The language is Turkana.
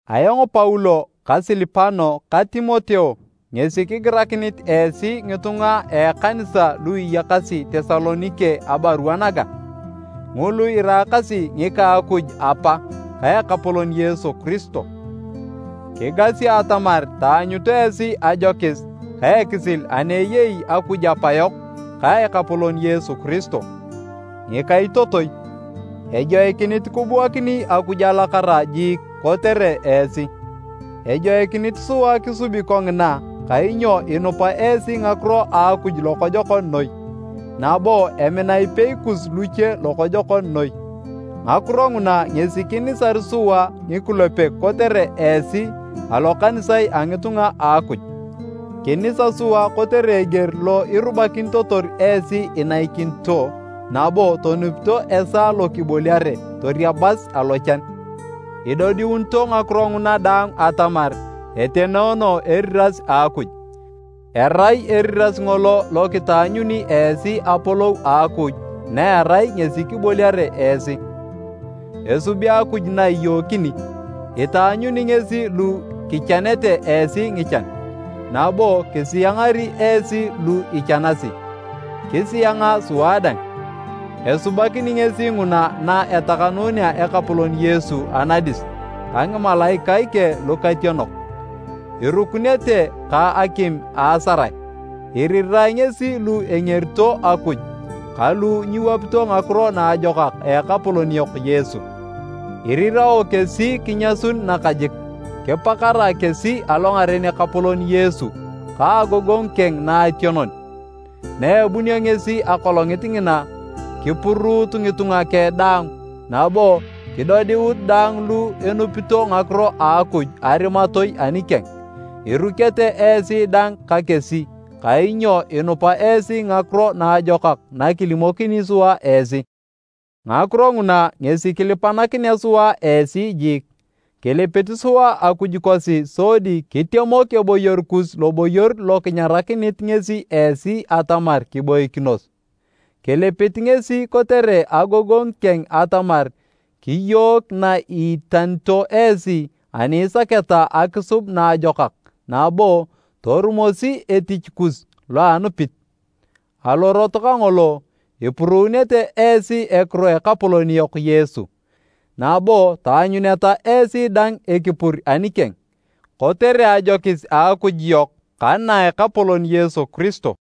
Ayong Paulo ka Silipano ta Timoteo ngesi kigirakinit esi ngitunga a ekanisa lu iyakasi Tesalonike abarua naga. Ngulu iraakasi ngika a Akuj Apa ka Ekapolon Yesu Kiristo. Kigasi atamar taanyut esi ajokis ka ekisil ani eyei Akuj Apayok ka Ekapolon Yesu Kiristo. Ngikaitotoi, ejoikinit kibuakini Akuj alakara jiik kotere esi. Ejoikinit sua kisubi kongina kainyo inupa esi ngakiro a Akuj lokojokon noi, nabo emina ipei kus luche lokojokon noi. Ngakiro nguna ngesi kinisar sua ngikulepek kotere esi alokanisae a ngitunga a Akuj. Kinisa sua kotere eger lo irubakinitotor esi inaikinito nabo tonupito esaa lo kiboliare, toriabas alochan. Idodiunito ngakiro nguna daang atamar etenoono eriras a Akuj, erai eriras ngolo lo kitaanyuni esi Apolou a Akuj na erai ngesi kiboliare esi. Esubi Akuj na iyookini, itaanyuni ngesi lu kichanete esi ngichan, nabo kisiangari esi lu ichanasi, kisianga sua dang. Esubakini ngesi nguna na etakanunea Ekapolon Yesu anadis ka ngimalaikae keng lukationok, irukunete ka akim a asarae. Irirae ngesi lu engerito Akuj ka lu nyiwapito Ngakiro Naajokak a Ekapolon yok Yesu. Irirao kesi kinyasun nakajik, kipakarae kesi alongaren Ekapolon Yesu ka agogongu keng naationon, na ebunio ngesi Akolongit ngina kipuruut ngitunga keng daang nabo kidodiut daang lu enupito ngakiro a Akuj arimatoi anikeng. Irukete esi dang ka kesi kainyo inupa esi ngakiro naajokak na kilimokini sua esi. Ngakiro nguna ngesi kilipanakinea sua esi jiik. Kilipit sua Akuj kosi sodi kitemok eboyor kus loboyor lo kinyarakinit ngesi esi atamar kiboikinos. Kilipit ngesi kotere agogongu keng atamar kiyook na iitanito esi ani isaketa akisub naajokak nabo torumosi etich kus loa anupit. Alorot kangolo, ipuruunete esi ekiro a Ekapolon yok Yesu, nabo taanyuneta esi dang ekipur anikeng, kotere ajokis a Akuj yok ka na a Ekapolon Yesu Kiristo.